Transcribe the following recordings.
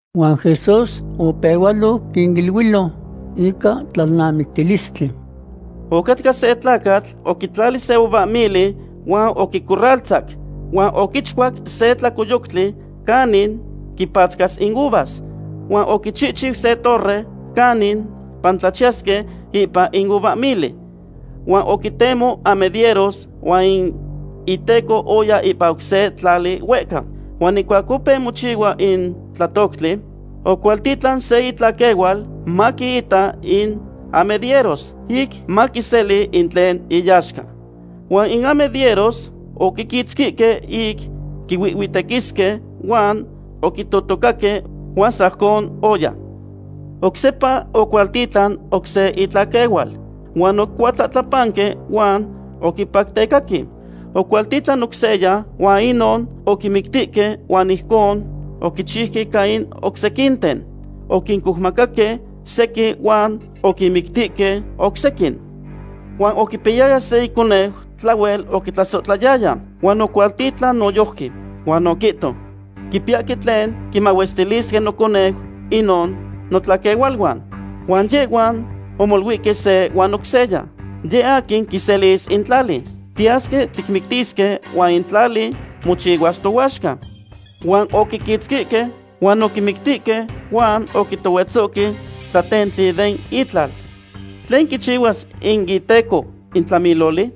Huan Jesús opehualoc quiniluilo ica tlalnamictilistli: ―Ocatca se tlacatl oquitlali se uvahmili huan oquicorraltzac. Huan oquichcuac se tlacoyoctli canin quipatzcas in uvas, huan oquichihchiu se torre canin pantlachiyahque ipan in uvahmili. ’Huan oquitemo amedieros huan in iteco oya ipan oc se tlali huehca. Huan ihcuac opeu mochihua in tlatoctli, ocualtitlan se itlaquehual maquiita in amedieros, ic maquiseli in tlen iyaxca. Huan in amedieros oquiquitzquihque ic quihuihhuitequisque huan oquitotocaque huan sajcon oya. Oc sepa ocualtitlan oc se itlaquehual, huan oquicuatlahtlapanque huan oquipactecaque. Ocualtitlan oc seya, huan inon oquimictihque huan ijcon oquinchiuque ica in oc sequinten. Oquincoumacaque sequin huan oquinmictihque oc sequin. ’Huan oquipiyaya se iconeu tlahuel oquitlasohtlayaya, huan ocualtitlan noyojqui. Huan oquihto: “Quipiyahque tlen quimahuestilisque noconeu inon notlaquehualuan.” Huan yehhuan omoluihque se huan oc seya: “Yeh aquin quiselis in tlali; tiyasque ticmictisque huan in tlali mochihuas tohuaxca.” Huan oquiquitzquihque huan oquimictihque huan oquitohuetzohque tlatentli den itlal. ’¿Tlen quichihuas in iteco in tlamiloli?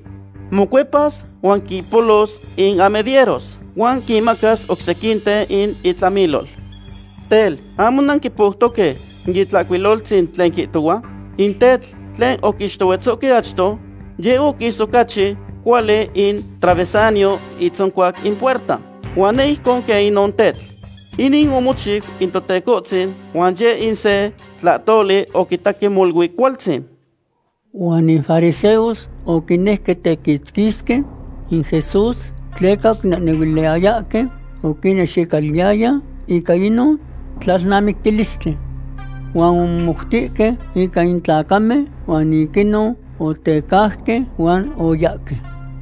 Mocuepas huan quimpolos in amedieros, huan quinmacas oc sequinten in itlamilol. ’Tel, ¿ahmo nanquipoutoque in Itlahcuiloltzin tlen quihtohua?: In tetl tlen oquixtohuetzohque achto, yeh oquis ocachi cuali in travesaño itzoncuac in puerta. Huan neh ijcon quen inon tetl. Inin omochiu in Totecohtzin, huan yeh in se tlahtoli tiquitahque molui cualtzin. Huan in fariseos oquinejque tequitzquisque in Jesús, tleca oquinehnehuiliyayahque oquinnexicaluiyaya ica inon tlalnamictilistli. Huan omomoutihque ica in tlacamen huan ic inon otecauque huan oyahque.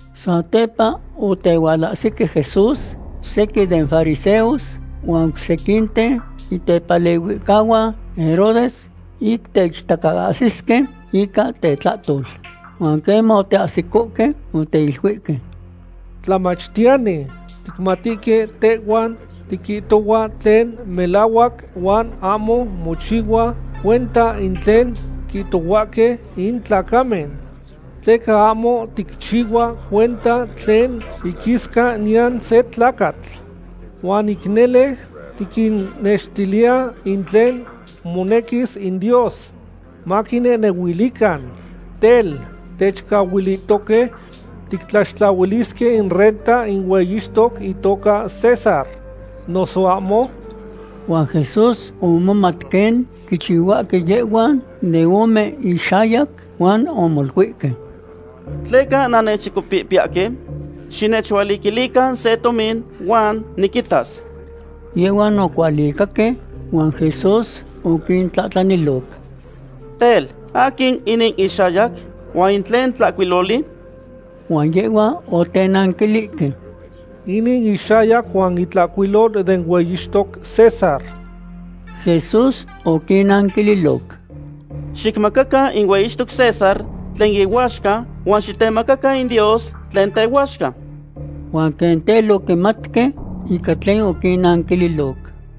Satepa otehualahsique Jesús sequin den fariseos huan oc sequinten itepalehuihcahuan Herodes, ic teichtacaahsisque ica tetlahtol. Huan queman oteahsicohque, oteiluihque: ―Tlamachtiyani, ticmatihque tehhua tiquihtohua tlen melahuac huan ahmo mochihua cuenta in tlen quihtohuahque in tlacamen, tleca ahmo ticchihua cuenta tlen iquisca niyan se tlacatl. Huan ic nele tiquinnextiliya in tlen monequis in Dios maquinehnehuilican. Tel, ¿techcahuilihtoque tictlaxtlahuilisque in renta in hueyixtoc itoca César, noso ahmo? Huan Jesús omomat quen quichihuahque yehhuan de ome inxayac huan omoluihque: ―¿Tleca nannechchicopihpiyahque? Xinechualiquilican se tomin huan niquitas. Yehhuan ocualicaque huan Jesús oquintlahtlaniloc: ―Tel, ¿aquin inin ixayac, huan in tlen tlahcuiloli? Huan yehhuan otenanquilihque: ―Inin ixayac huan itlahcuilol den hueyixtoc César. Jesús oquinnanquililoc: ―Xicmacacan in hueyixtoc César tlen ihuaxca huan xitemacacan in Dios tlen tehuaxca. Huan quen tel oquimatque ica tlen oquinnanquililoc.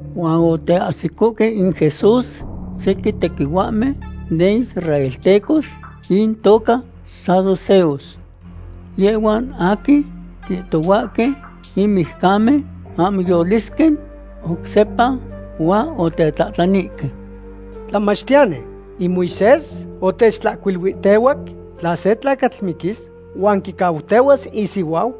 Huan oteahsicohque in Jesús sequin tequihuahmen den israeltecos intoca saduceos. Yehhuan aquin quihtohuahque in mijcamen ahmo yolisque oc sepa, huan otetlahtlanihque: ―Tlamachtiyani, in Moisés otechtlahcuiluihtehuac tla se tlacatl miquis huan quicautehuas isihuau,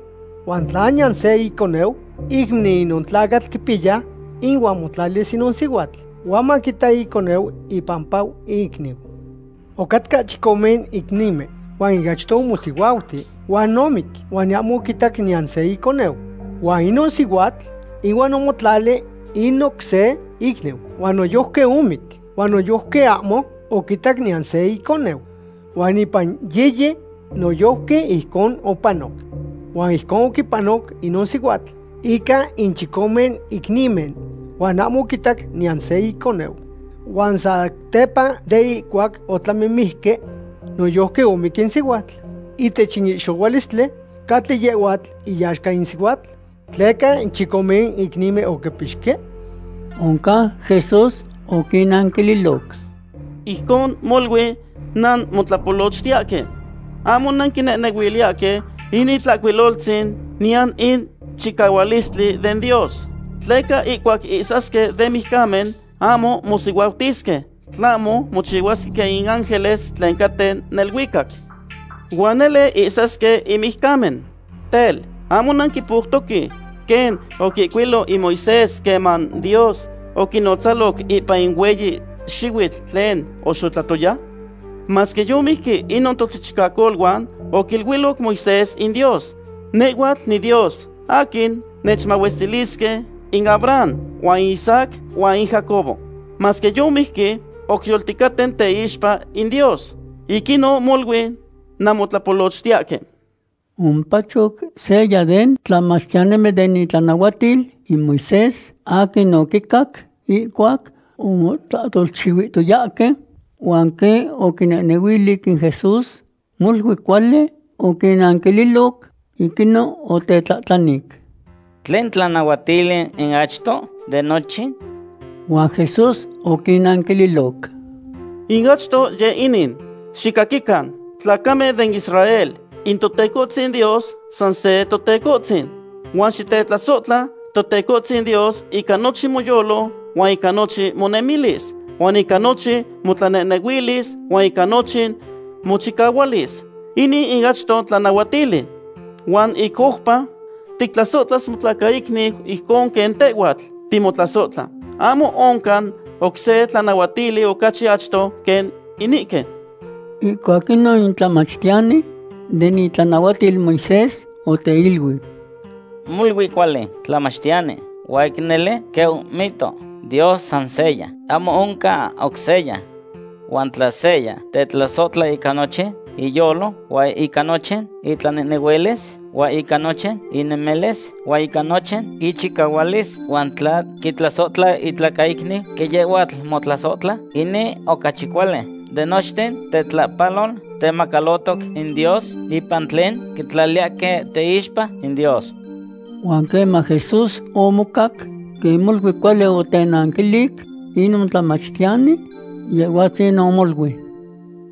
huan tla niyan se iconeu, iicniu inon tlacatl quipiya ihuan motlalis inon sihuatl huan maquita iconeu ipampa icniu. Ocatcahque chicome icnimen. Huan in achto omosihuauti huan omic, huan ahmo oquitac niyan se iconeu. Huan inon sihuatl ihuan omotlali in oc se icniu huan noyojqui omic, huan noyojqui ahmo oquitac niyan se iconeu. Huan ipan yiyi noyojqui ijcon opanoc. Huan ijcon oquipanoc inon sihuatl ica in chicome icnimen huan ahmo oquitac niyan se iconeu. Huan satepa de ihcuac otlamimijque, noyojqui omic in sihuatl. Ihtech in ihxohualistli, ¿catli yehhuatl ihuaxca in sihuatl, tleca in chicome icnimen oquipixque? Oncan Jesús oquinnanquililoc: ―Ijcon molui nanmotlapolochtiyahque. Ahmo nanquinehnehuiliyahque in Itlahcuiloltzin niyan in chicahualistli den Dios. Tleca ihcuac ihsasque den mijcamen, ahmo mosihuautisque, tlahmo mochihuasque quen in ángeles tlen caten neluicac. Huan nele ihsasque in mijcamen. Tel, ¿ahmo nanquipoutoque quen oquihcuilo in Moisés queman Dios oquinotzaloc ipan in hueyi xihuitl tlen oxotlatoya? Masque yomijque inon tochichicacoluan, oquiluiloc Moisés in Dios: “Nehhuatl niDios aquin nechmahuestilisque in Abraham, huan in Isaac huan in Jacobo.” Masque yomijque, oc yolticaten teixpa in Dios. Ic inon molui nanmotlapolochtiyahque. Omopacho seya den tlamachtiyanimen den itlanahuatil in Moisés aquin oquicac ihcuac omotlahtolchihuihtoyahque, huan quen oquinehnehuili in Jesús molui cuali oquinnanquililoc, ic inon otetlahtlanic: ―¿Tlen tlanahuatili in achto de nochin? Huan Jesús oquinanquililoc: ―In achto yeh inin: “Xicaquican, tlacamen den Israel, in Totecohtzin Dios san se Totecohtzin. Huan xitetlasohtla Totecohtzin Dios ica nochin moyolo huan ica nochin monemilis, huan ica nochin motlanehnehuilis huan ica nochin mochicahualis.” Inin in achto tlanahuatili. Huan ic oupa: “Tictlasohtlas motlacaicniu ijcon quen tehhuatl timotlasohtla.” Ahmo oncan oc se tlanahuatili ocachi achto quen inihque. Ihcuac inon in tlamachtiyani den itlanahuatil Moisés oteiluic: ―Molui cuali, tlamachtiyani, huan ic nele quen omihtoc; Dios san seya; ahmo oncan oc seya. Huan tla seya tetlasohtla ica nochin iyolo huan ica nochin itlanehnehuilis huan ica nochin inemilis huan ica nochin ichicahualis, huan tla quitlasohtla itlacaicniu quen yehhuatl motlasohtla, inin ocachi cuali de nochten tetlahpalol temacalotoc in Dios ipan tlen quitlaliyahque teixpa in Dios. Huan queman Jesús omocac quen molui cuali otenanquilic inon tlamachtiyani, Yehhuatzin omoluic: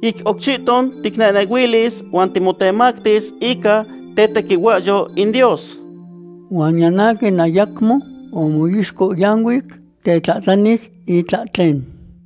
―Ic oc chihton ticnehnehuilis huan timotemactis ica tetequihuahyou in Dios. Huan niyan aquin ayacmo omixcohyanuic tetlahtlanis itlahtlen.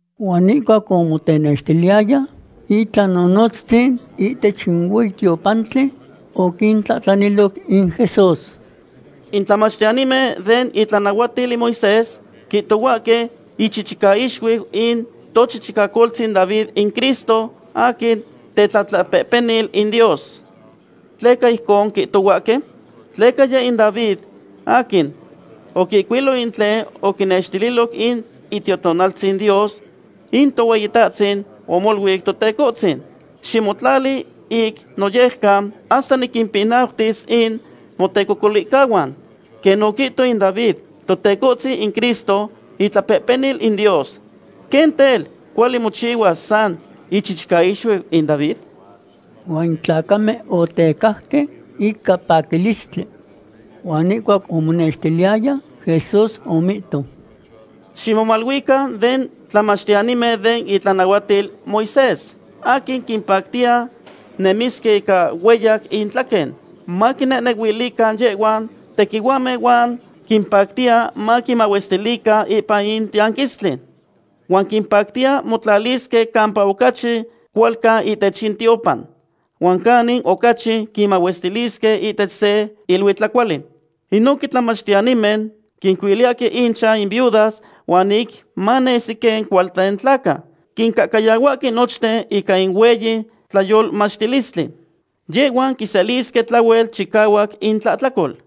Huan ihcuac omotenextiliyaya itlahtoltzin ihtech in hueyi tiopantli, oquintlahtlaniloc in Jesús: ―In tlamachtiyanimen den itlanahuatil in Moisés quihtohuahque ichichicaixuiu in tochichicacoltzin David in Cristo aquin tetlapehpenil in Dios. ¿Tleca ijcon quihtohuahque? Tleca yeh in David aquin oquihcuiloc in tlen oquinextililoc in Itiotonaltzin Dios: In Tohueyitahtzin omoluic Totecohtzin: “Ximotlali ic noyejcan hasta niquimpinautis in motecocolihcahuan.” Quen oquihto in David, Totecohtzin in Cristo itlapehpenil in Dios. ¿Quen tel, cuali mochihuas sa ichichicaixuiu in David? Huan in tlacamen otecajque ica paquilistli. Huan ihcuac omonextiliyaya, Jesús omihto: ―Ximomaluican den tlamachtiyanimen den itlanahuatil Moisés aquin quimpactiya nemisque ica hueyac intlaquen, maquinehnehuilican yehhuan tequihuahmen huan quimpactiya maquimahuestilican ipan in tianquistli. Huan quimpactiya motlalisque campa ocachi cualcan ihtech in tiopan, huan canin ocachi quinmahuestilisque ihtech se iluitlacuali. Inohque tlamachtiyanimen quincuiliyahque inchan in viudas huan ic manesi quen cualten tlaca, quincahcayahuahque nochten ica in hueyi tlayolmachtilistli. Yehhuan quiselisque tlahuel chicahuac intlahtlacol.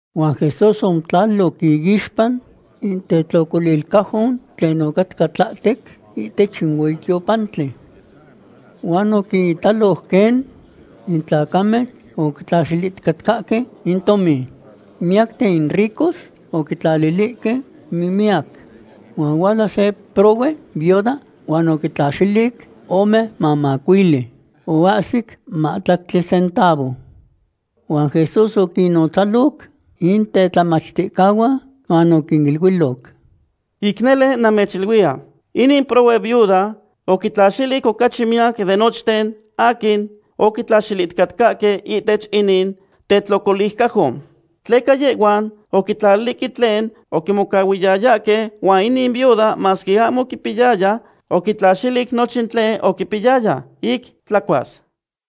Huan Jesús omotlaliloc iixpa in tetlocolilcajon tlen ocatca tlahtec ihtech in hueyi tiopantli. Huan oquinitaloc quen in tlacamen oquitlaxilihticatcahque in tomin. Miyacten in ricos oquitlalilihque mimiyac. Huan ohuala se prohue viuda huan oquitlaxilic ome mamacuili, oahsic mahtlactli centavo. Huan Jesús oquinnotzaloc in tetlamachticahuan huan oquiniluiloc: ―Ic nele namechiluiya, inin prohue viuda oquitlaxilic ocachi miyac de nochten aquin oquitlaxilihticatcahque ihtech inin tetlocolilcajon. Tleca yehhuan oquitlalilihque tlen oquimocahuiyayahque, huan inin viuda masque ahmo oquipiyaya, oquitlaxilic nochin tlen oquipiyaya, ic tlacuas.